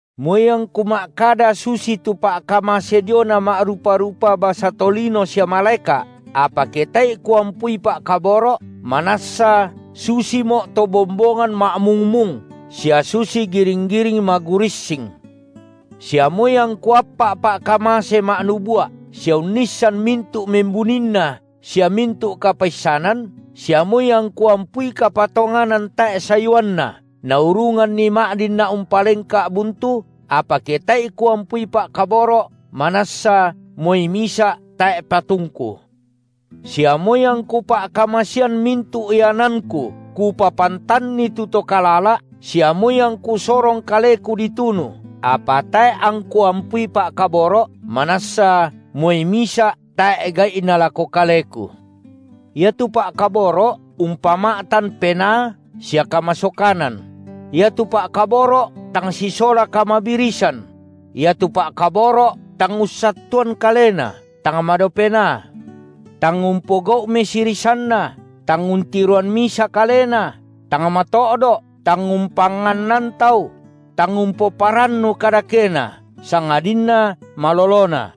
Moi angku ma’kada susitu pa’kamase diona ma’rupa-rupa basa tolino sia malaeka’, apa ke tae’i kuampui pa’kaboro’, manassa susimo’ to bombongan ma’mung-mung sia susi giring-giring magurissing. Sia moi angku appa’ pa’kamase ma’nubua’, sia unnissan mintu’ membuninna sia mintu’ kapaissanan, sia moi angku ampui kapatonganan tae’ sayuanna, naurunganni ma’dinna’ umpalengka’ buntu, apa ke tae’i kuampui pa’kaboro’, manassa moi misa’ tae’ patungku. Sia moi angku pa’kamasean mintu’ iananku kupapantanni tu to kalala’, sia moi angku sorong kaleku ditunu, apa tae’ angku ampui pa’kaboro’, manassa moi misa’ tae’ gai’na lako kaleku. Iatu pa’kaboro’ umpama’tan penaa sia kamasokanan; iatu pa’kaboro’ tang sisola kamabirisan; iatu pa’kaboro’ tang ussattuan kalena, tang madao penaa; tang umpogau’ mesirisanna, tang untiroan misa kalena, tang mato’do’, tang umpangannan tau; tang umpomarannu kadakena, sangadinna malolona.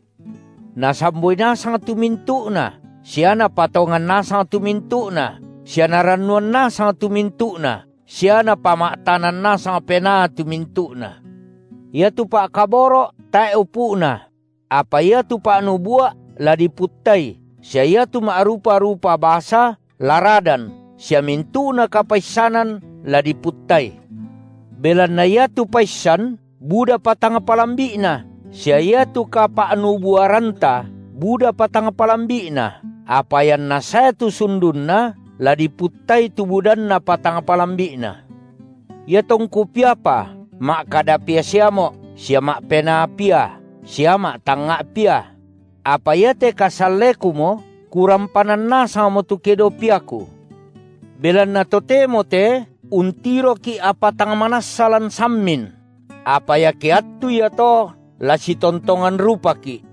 Nasamboi nasang tu mintu’na sia napatongan nasang tu mintu’na, sia narannuan nasang tu mintu’na sia napama’tanan nasang penaa tu mintu’na. Iatu pa’kaboro’ tae upu’na; apa iatu pa’nubua’ la diputtai sia iatu ma’rupa-rupa basa la radan sia mintu’na kapaissanan la diputtai. Belanna iatu paissan budapa tang palambi’na sia iatu kapa’nubuaranta budapa tang palambi’na, apa ianna sae tu sundunna, la diputtai tu budannapa tang palambi’na. Iatongku piapa, ma’kada pia siamo’, sia ma’penaa pia sia ma’tangnga’ pia; apa iate kasallekumo, kurampanan nasangmo tu kedo piaku. Belanna totemo te untiroki’ apa tang manassa lan sammin; apa iake attu iato la sitontongan rupaki’.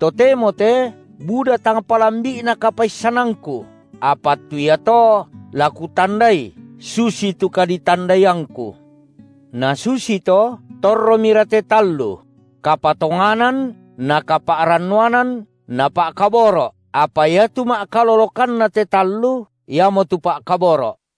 Totemo te buda tang palambi’na kapaissanangku, apa attu iato la kutandai susitu kaditandaiangku. Nasusito torromira te tallu: kapatonganan na kapa’rannuanan na pa’kaboro’, apa iatu ma’kalolokanna te tallu, iamotu pa’kaboro’.